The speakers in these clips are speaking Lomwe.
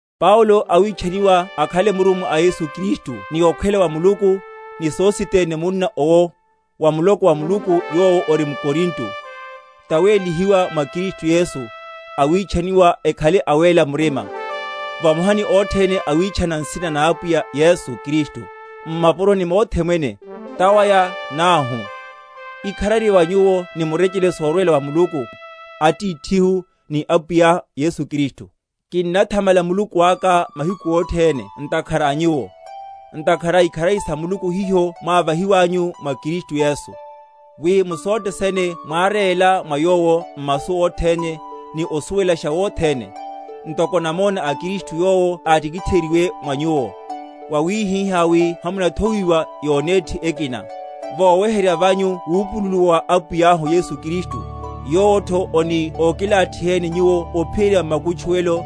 Paulo awitchaniwa akhale murummwa a Yesu Kristu ni okhwela wa Muluku, ni Sositene munna owo, wa muloko wa Muluku yowo ori m’Korinto, tawélihiwa mwa Kristu Yesu, awitchaniwa ekhale awéla murima, vamoha ni othene awitchana nsina na Apwiyahu Yesu Kristu, m’mapuroni mothe mwene, tawaya náuhu: Ikharari wa nyuwo ni murechele sorwela wa Muluku Atithihu, ni Apwiya Yesu Kristu. Kinnathamala Muluku aka mahiku othene ntakhara a nyuwo, ntakhara a ikharari sa Muluku hiho mwávahiwanyu mwa Kristu Yesu; wi mu sothe sene mwáréla mwa Yowo, m’masu othene, ni osuwelasha wothene; ntoko namona a Kristu yowo átikitheryiwe mwa nyuwo; wawihihá wi hamunathowiwa yonéthi ekina; voweherya vanyu wupululuwa wa Apwiyahu Yesu Kristu; yowotho oni ókilathiheni nyuwo ophiyerya makutchuwelo,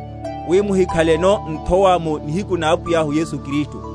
wi muhikhaleno nthowa mu nihiku na Apwiyahu Yesu Kristu.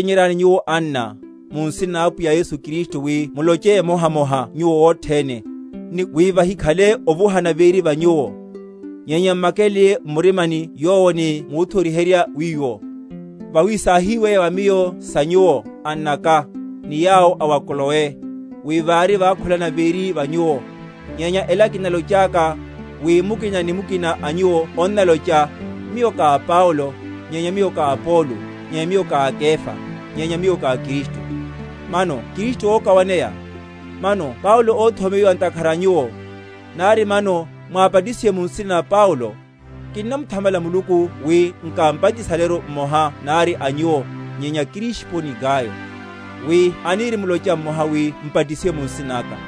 Nyenya kinnochényeryani nyuwo, anna, mu nsina na Apwiyahu Yesu Kristu, wi muloche emohamoha nyuwo othene, ni wi vahikhale ovuhana véri va nyuwo; nyenya m’makeleleye m’murimani yowo ni múthori?-?herya wiwo. Vawi sáhíweya wa miyo sa nyuwo, annaka, ni yawo a wa Kloe, wi vari wakhulana véri va nyuwo. Nyenya ela kinalochaka, wi mukina ni mukina a nyuwo onnalocha, Miyo ka a Paulo; nyenya miyo ka a Apolo; nyenya miyo ka a Kefa; nyenya miyo ka a Kristu. Mano Kristu ókawaneya? Mano Paulo óthomeyiwa ntakhara a nyuwo? Nari mano mwábatisiwa mu nsina na Paulo? Kinnamuthamala Muluku wi nkámbatisaleru mmoha nari a nyuwo, nyenya Krisipo ni Gayo; wi anirimlocha mmoha wi mbatisiwe mu nsina naka.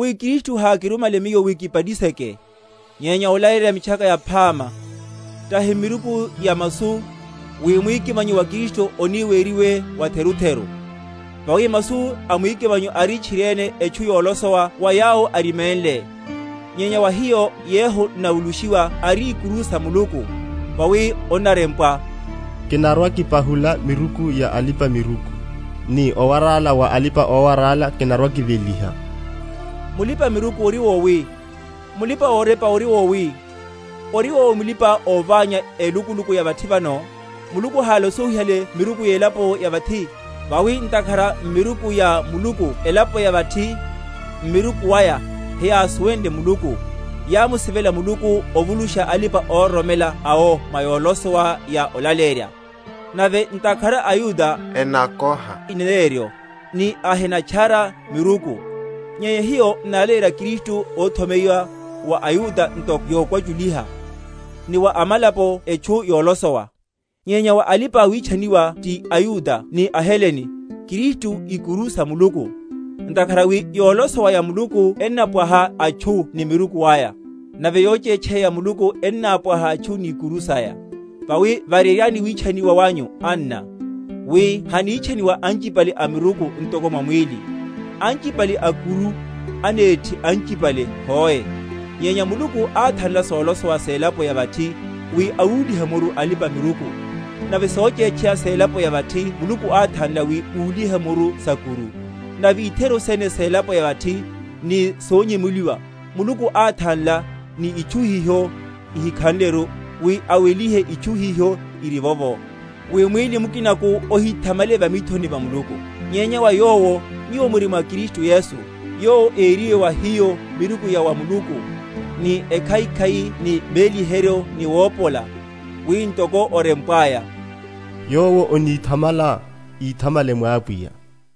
Vawi Kristu hákirumme miyo wi kibatiseke, nyenya olaleyerya Mitchaka Yaphama, tahi m’miruku ya masu, wi mwikimanyo wa Kristu oni weriwe watherutheru. Vawi masu a mwikimanyo ari tchiriene etchu yolosowa wa yawo ariménle, nyenya wa hiyo yehu n’navulushiwa ari ikuru sa Muluku. Vawi onnarempwa, Kinarwa‐kipahula miruku ya alipa‐miruku, Ni owarala wa alipa‐owarala kinarwa‐kiveliha. Mulipa‐miruku ori wowi? Mulipa‐orepa ori wowi? Ori wowi mulipa‐oványa élukuluku ya vathi vano? Muluku hálosowihale miruku yelapo ya vathi? Vawi ntakhara m’miruku ya Muluku elapo ya vathi, m’miruku aya, heyámusuwenle Muluku, yámusivela Muluku ovulusha alipa‐ororomela awo mwa yolosowa ya olaleyerya. Nave ntakhara aYuda enakoha ineneryo, ni aHenatchara miruku; nyenya hiyo n’nalaleyerya Kristu óthomeyiwa, wa aYuda nto yokwachuliha, ni wa amalapo etchu yolosowa; nyenya wa alipa‐witchaniwa ti aYuda ni aHelene, Kristu, ikuru sa Muluku. Ntakhara wi yolosowa ya Muluku ennapwaha atchu ni miruku aya; nave yochétcheya ya Muluku ennapwaha atchu ni ikuru saya. Vawi vareryani witchaniwa wanyu, anna, wi hanítchaniwa anchipale amiruku, ntoko mwa mwíli; anchipale a’kuru, anéthi anchipale, hoe; nyenya Muluku áthanla solosowa selapo ya vathi, wi awúlihe muru alipa‐miruku; nave sochétcheya selapo ya vathi Muluku áthanla, wi úlihe muru sa’kuru; nave itheru sene selapo ya vathi, ni sonyemuliwa, Muluku áthanla, ni itchu hiho ihikhanleru, wi awelihe itchu hiho irivovo; wi mwíli mukinaku ohíthamale va mithoni va Muluku. Nyenya wa Yowo nyuwo muri mwa Kristu Yesu, yowo ériwe wa hiyo miruku ya wa Muluku, ni ekhaikhai ni méliheryo ni wopola; wi ntoko orempwaya, Yowo aníthamala, íthamalele mwa Apwiya.